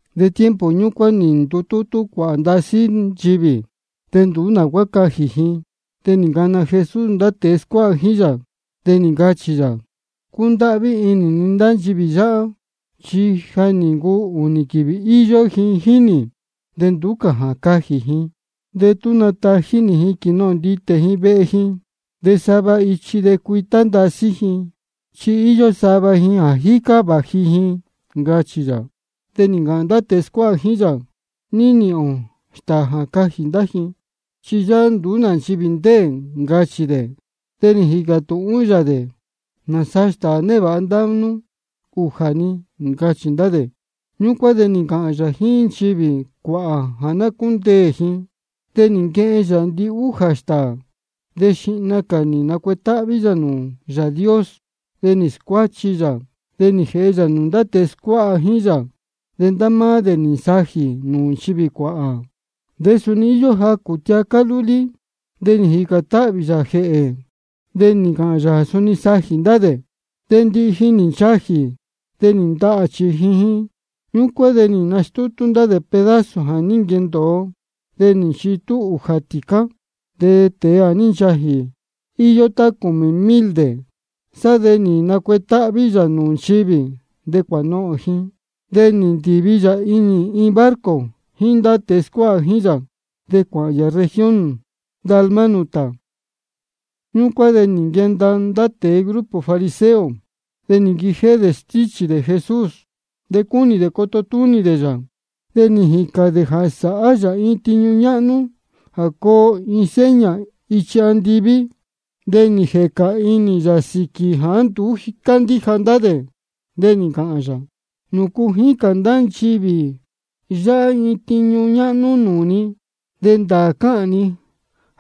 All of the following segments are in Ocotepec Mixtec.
De tiempo ñúcuán nī ndutútú cuāhā ndasí nchivī, de nduú nā cuá cajī ji. De nī ncana Jesús ndá tēe scuáha jíín yā, de nī ncāhān yā: Cúndáhví inī ni ndá nchivī yáhá, chi ja nī ncuu ūnī quīvī íyó ji jíín nī, de nduú cā jā cajī ji. De tú natají nī ji quīnohōn nditē ji vehe ji, de sava ichi de cuitá ndasí ji, chi íyó sava ji jā jícá vāji ji, ncachī yā. De nī ncāhān ndá tēe scuáha jíín yā: ¿De ní nīhīn ō stāā jā cajī ndá ji? Chi yáhá nduú nā nchivī ndéē, ncachī dē. De nī jīcā tūhún yā dē: ¿Nāsaa stāā névāha ndá nú? Ujā-ni, ncachī ndá dē. Ñúcuán de nī ncāhān yā jíín nchivī cuāhā jā ná cúndeē ji. De nī nquehen yā ndihújā stāā, de xihna cā nī nacuetáhví yā nūū Yāā Dios. De nī scuáchi yā, de nī jēhe yā nūū ndá tēe scuáha jíín yā. De ndá máá dē nī nsajī dē nūū nchivī cuāhā. De suni íyó jacū tiacá lúlí. De nī jīcān táhvī yā jēhē, de nī ncāhān yā jā suni sajī ndá dē. De ndihi ji nī nchajī, de nī ndahā chījin ji. Ñúcuán de nī nastútú ndá dē pedazo jā ní nquendōo, de nī nchitú ūjā tīcá. De tēe jā ní nchajī, íyó tá cūmī mil dē. Sá de nī nacuetáhví yā nūū nchivī, de cuānohōn ji. De nī ndīvi yā-ni inī barco jíín ndá tēe scuáha jíín yā, de cuāhān yā región Dalmanuta. Ñúcuán de nī nquenda ndá tēe grupo fariseo, de nī nquijéhé dē stíchī dē Jesús. De cúnī ndá dē coto túnī dē yā, de nī jīcān dē jā sāhá yā iin tiñu ñáhnú jā coo iin seña ichi andiví. De nī jēca inī yā sīquī jāá nduú cándíja ndá dē, de nī ncāhān yā: ¿Nūcu jícān ndá nchivī yáhá iin tiñu ñáhnú nūū ni? De ndāā cáhān ni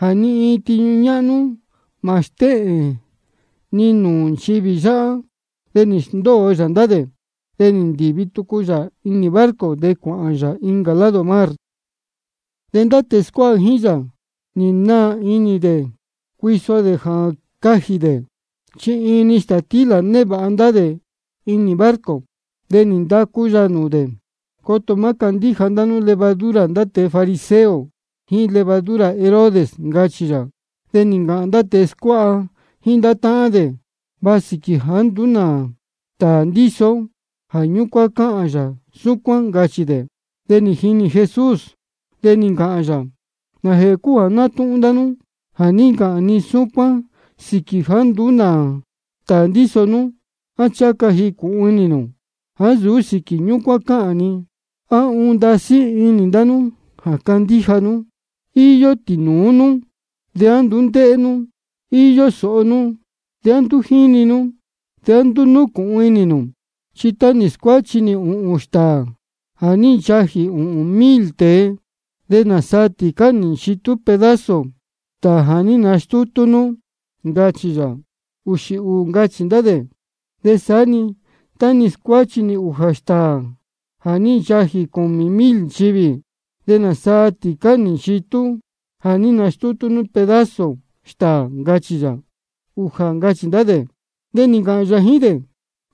jā ni iin tiñu ñáhnú mā stéhēn ni nūū nchivī yáhá. De nī sndóo yā ndá dē, de nī ndīvi tucu yā inī barco, de cuāhān yā incā lado mar. De ndá tēe scuáha jíín yā, nī naā inī dē cuiso dē jā cajī dē, chi iin-ni stātílā névāha ndá dē inī barco. De nī ndacu yā nūū dē: Coto má candíja ndá nú levadura ndá tēe grupo fariseo jíín levadura Herodes, ncachī yā. De nī ncāhān ndá tēe scuáha jíín ndá táhán dē: Va sīquī jāá nduú nā stāā ndíso ó, jā ñúcuán cáhān yā súcuán, ncachī dē. De nī jinī Jesús, de nī ncāhān yā: ¿Nājēhē cúu jā nátúhún ndá nú jā ní ncāhān ni súcuán sīquī jāá nduú nā stāā ndíso nú? ¿A ncháha ca cunī nū, á ncháha ca jīcūhun inī nū jāá nsūú sīquī ñúcuán cáhān ni? ¿A uun ndasí inī ndá nú jā candíja nú? Iyó tīnūú nú, ¿de á nduú ndéhé nú? Iyó sōho nú, ¿de á nduú jíni nú? ¿De á nduú núcūhun inī nū? Chi tá nī scuáchi nī ūhūn stāā jā ní nchajī ūhūn mil tēe, ¿de nāsaa tīcá nī nchitú pedazo stāā jā ní nastútú nú? ncachī yā. Uxī ūū, ncachī ndá dē. De saá-ni tá nī scuáchi nī ūjā stāā jā ní nchajī cūmī mil nchivī, ¿de nāsaa tīcá nī nchitú jā ní nastútú nú pedazo stāā? ncachī yā. Ujā, ncachī ndá dē. De nī ncāhān yā jíín dē: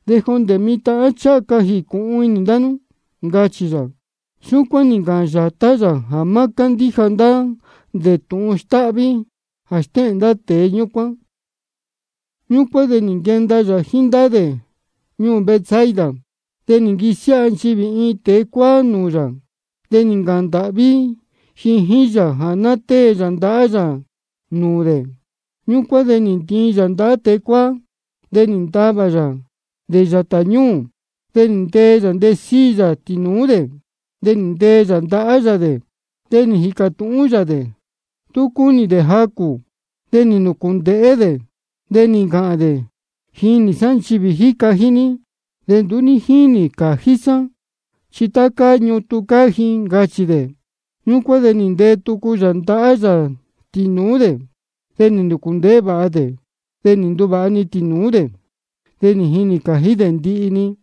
¿De jondē mitan á ncháha ca jīcūhun inī ndá nú? ncachī yā. Súcuán nī ncāhān yātá yā jā má cándíja ndá dē tūhun stáhví jā stéhēn ndá tēe ñúcuán. Ñúcuán de nī nquenda yā jíín ndá dē ñuū Betsaida. De nī nquisiáha nchivī iin tēe cuáá nūū yā, de nī ncāhān ndāhví ji jíín yā jā ná tée yā ndahá yā nūū dē. Ñúcuán de nī ntiin yā ndahá tēe cuáá, de nī ntavā yā dē yātā ñúū. De nī ntee yā ntesíi yā tīnūú dē, de nī ntee yā ndahá yā dē. De nī jīcā tūhún yā dē tú cuu cunī dē jacū. De nī nūcūndēhé dē, de nī ncāhān dē: Jínī sá nchivī jā jíca ji, de nduú jínī cājí sá, chi tá cáá ñutun cáá ji, ncachī dē. Ñúcuán de nī ntee tucu yā ndahá yā tīnūú dē. De nī nūcūndēhé vāha dē, de nī nduvāha-ni tīnūú dē, de nī jinī cājí dē ndihi-ni.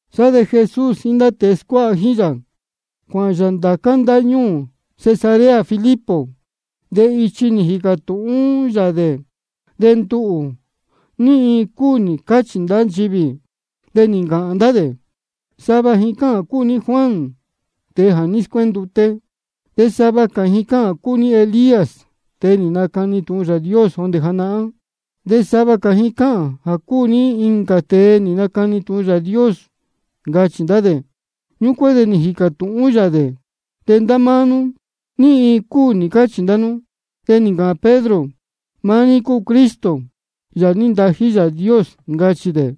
Sá de Jesús jíín ndá tēe scuáha jíín yā, cuāhān yā ndācá ndáñúū Cesarea Filipo. De ichi nī jīcā tūhún yā dē: De nduhū, ¿ní iin cúu nī cáchī ndá nchivī? De nī ncāhān ndá dē: Sava ji cáhān jā cúu ní Juan, tēe jā ní scuénduté. De sava cā ji cáhān jā cúu ní Elías, tēe nī nacani tūhun Yāā Dios jondē janahán. De sava cā ji cáhān jā cúu ní incā tēe nī nacani tūhun Yāā Dios, ncachī ndá dē. Ñúcuán de nī jīcā tūhún yā dē: De ndá máá nú, ¿ní iin cúu nī cáchī ndá nú? De nī ncāhān Pedro: Maá ní cúu Cristo, Yāā jā ní ntají Yāā Dios, ncachī dē.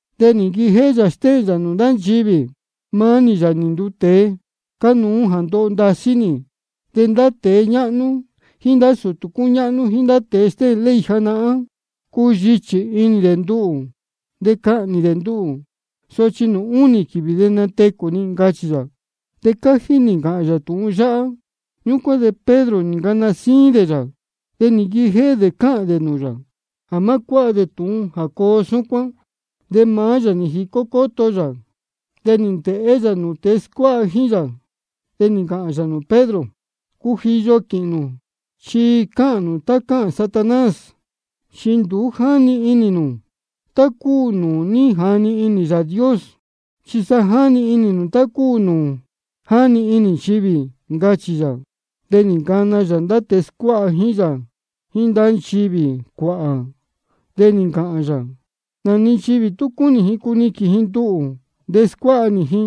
De nī nquijéhé yā stéhēn yā nūū ndá dē: Maá nī, Yāā nī nduu tēe, cánuú jā ndoho ndasí nī. De ndá tēe ñáhnú jíín ndá sūtū cúñáhnú jíín ndá tēe stéhēn ley janahán, cuyichī inī dē nduhū, de cahnī dē nduhū. Sochi nūū únī quīvī de natecū ni, ncachī yā. De cájí nī ncāhān yā tūhun yáhá. Ñúcuán de Pedro nī ncana síín dē yā, de nī nquijéhé dē cáhān dē nūū yā jā má cuáha yā tūhun jā coo súcuán. De maá yā nī jicó cóto yā, nī ndēhé yā nūū ndá tēe scuáha jíín yā. De nī ncāhān yā nūū Pedro: Cujiyo quīhīn nū, chi cáhān nū tá cáhān Satanás. Chi nduú jáni inī nū tá cúu nūū jáni inī Yāā Dios, chi sa jáni inī nū tá cúu nūū jáni inī nchivī, ncachī yā. De nī ncana yā ndá tēe scuáha jíín yā jíín ndá nchivī cuāhā, de nī ncāhān yā: Nā-ni nchivī tú cúnī ji cuniquīn ji nduhū jā scuáha nī ji,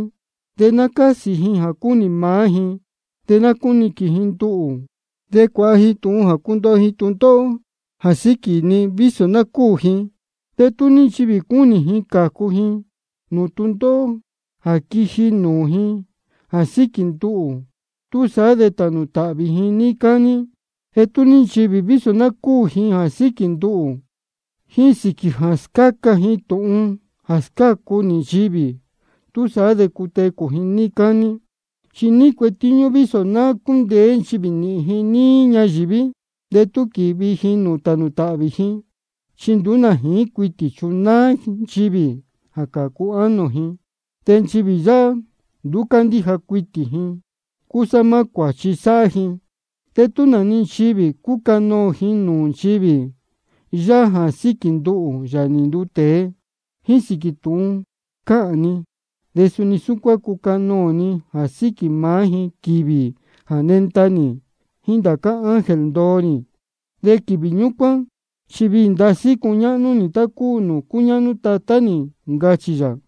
de ná cásī ji jā cúnī maá ji, de ná cúniquīn ji nduhū de cuāha ji tūhun jā cundoho ji tūndóhó jā síquī ni, vísō ná cúū ji. De tú ní nchivī cúnī ji cācu ji nūū tūndóhó jā quiji nūū ji jā síquī nduhū, túsaá de tānū tāhvī ji níí cání. De tú ní nchivī vísō ná cúū ji jā síquī nduhū jíín sīquī jā scáca ji tūhun jā scácu nī nchivī, túsaá de cutecū ji níí cání. ¿Chi ní cuetíñú vísō ná cúndeé nchivī nīhīn ji níí ñayīví, de tú quīvi ji nūū tānū tāhvī ji? Chi nduú nā jīín cuitī chunáá nchivī jā cācu ánō ji. De nchivī yáhá nduú cándíja cuitī ji, de cúsá maá cuāchi sáhá ji. De tú nā-ni nchivī cúcanoō ji nūū nchivī yáhá jā síquī nduhū, Yāā nī nduu tēe, jíín sīquī tūhun cáhān ni, de suni súcuán cucanoō ni jā síquī maá ji, quīvī jā nenda nī jíín ndācá ángel ndoo nī. De quīvī ñúcuán chi viī ndasí cuñáhnú nī, tá cúu nūū cúñáhnú Tatá nī, ncachī yā.